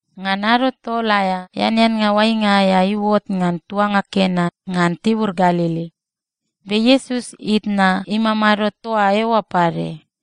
Ngan ado tol aea, eaneannga oainga aea iuot ngan tuanga Kena ngan tibur Galili. Be Iesus itna imamado toa eoa pade.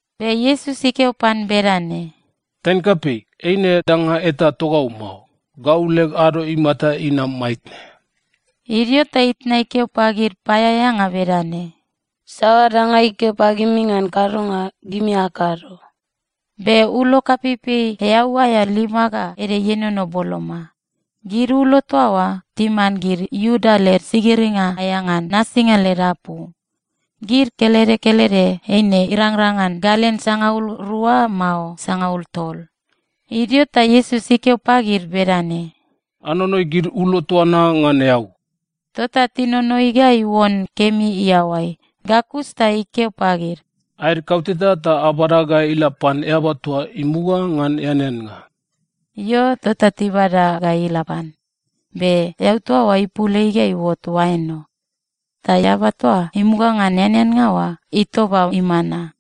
Be Iesus ikeo pan bedane, “Taine kapei, eine danga eta togau mao. Gau leg ado imata inam maitne.” Idio ta itna ikeo pagid paeaeanga bedane, “Saoa danga ikeo pagimi ngan kadonga, gimi akado.” Be ulo kapeipei eau aea lima ga ede ienono boloma. Gid ulo toa oa timan gid Iuda led sigiringa aea ngan nasinga led apu. Gid kelede kelede eine irangrang ngan galen sangaul rua mao sangaul tol. Idio ta Iesus ikeo pagid bedane, “Anonoi gid ulo toa na ngan eau.” Tota tinonoi ga iuon kemi iaoai. Ga kus ta ikeo pagid, “Aed kauteta ta abada ga ila pan eaba toa imuga ngan eaneannga.” Io, tota tibada ga ila pan. Be eau toa oa ipul ei ga iuot oain o. Ta eaba toa imuga ngan eaneannga oa itoba imana.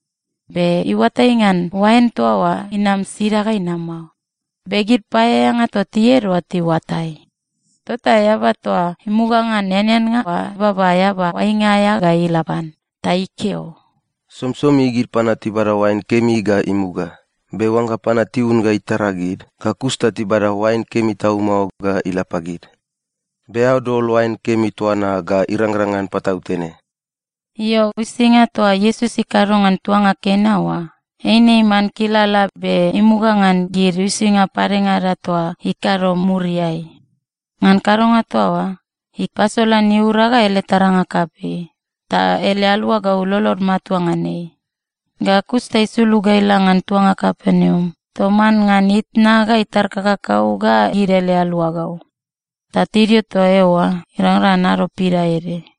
Be iuatai ngan oain toa oa inam sida ga inam mao. Be gid paeaeanga toa tied oa tiuatai. Tota eaba toa imuga ngan eaneannga oa ibaba eaba oainga aea ga ila pan ta ikeo, “Somisomi gid panua tibada oain kemi ga imuga, be oangga panua tiun ga itara gid, ga kus ta tibada oain kemi tau mao ga ila pagid. Be eao dol oain kemi toa na ga irangrang ngan patautene.” Io, uisinga toa Iesus ikado ngan tuanga Kena oa, eine iman kilala be imuga ngan gid uisinga padengada toa ikado muriai. Ngan kadonga toa oa, ipasolan iura ga ele taranga kapei, ta ele aluagau lolod matua ngan ei. Ga kus ta isulug ga ila ngan tuanga Kapernaum toman ngan itna ga itar kakakau ga gid ele aluagau. Ta tidio toa eoa irangrang ngan ado pidaede.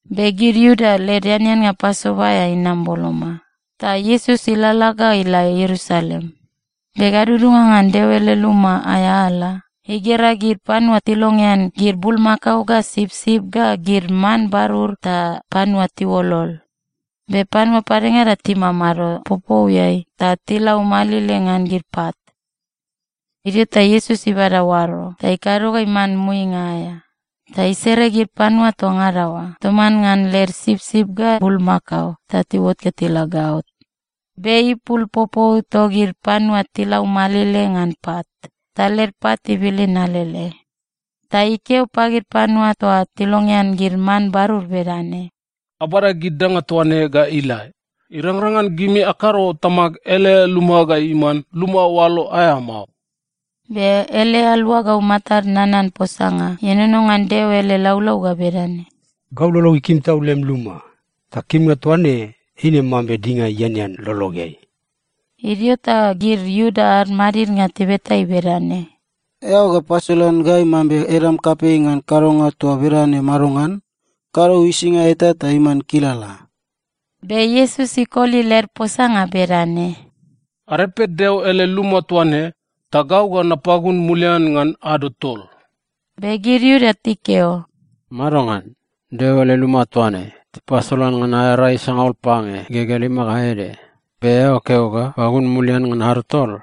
Be gid Iuda led eaneannga Pasova aea inam boloma. Ta Iesus ilalala ga ila Ierusalem. Be gadudunga ngan Deo ele luma aea ala, igera gid panua tilongean gid bulmakao ga sipsip ga gid man barur ta panua tiuolol. Be panua padengada timamado popouiai ta tilaumalile ngan gid pat. Idio ta Iesus ibada oaro ta ikado ga iman muinga aea, ta isere gid panua toa ngada oa toman ngan led sipsip ga bulmakao ta tiuot ga tila gaot. Be ipul popou togid panua tilaumalile ngan pat, ta led pat ibilin alele. Ta ikeo pagid panua toa tilongean gid man barur bedane, “Abada gid danga toa ne ga ila. Irangrang ngan gimi akado Tamag ele luma ga iman luma oalo aea mao!” Be ele aluagau matad nanan posanga ienono ngan Deo ele laulau ga bedane, “Gau lolog ikim tau lem luma, ta kimnga toa ne eine mambe dinga ianean lologeai.” Idio ta gid Iuda ad madidnga tibeta ei bedane, “Eao ga pasolan gai mambe edam kapei ngan kadonga toa bedane madongan? Kado uisinga eta ta iman kilala!” Be Iesus ikoli led posanga bedane, “Arepe Deo ele luma toa ne, ta gau ga napagun mulian ngan ado tol.” Be gid Iuda tikeo, “Madongan? Deo ele luma toa ne, tipasala ngan aea rai sangaul pange igegea lima ga ede. Be eao keo ga pagun mulian ngan ado tol?”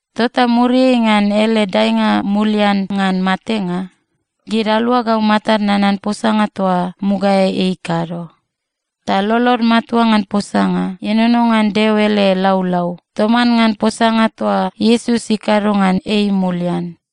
Tota muriai ngan ele daenga mulian ngan matenga, gid aluagau matad nanan posanga toa mugaeai ei ikado. Ta lolod matua ngan posanga ienono ngan Deo ele laulau toman ngan posanga toa Iesus ikado ngan ei mulian.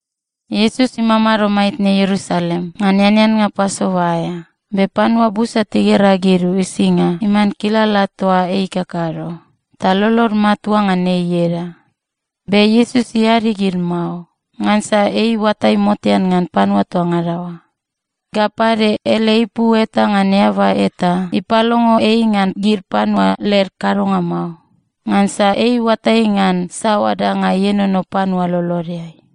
Iesus imamado maitne Ierusalem ngan eaneannga Pasova aea, be panua busa tigera gid uisinga iman kilala toa ei ikakado, ta lolod matua ngan ei ieda. Be Iesus iadi gid mao, ngansa ei iuatai motean ngan panua toa ngada oa. Ga pade, ele ipu eta ngan eaba eta ipalongo ei ngan gid panua led kadonga mao, ngansa ei iuatai ngan saoa danga ienono panua lolodeai.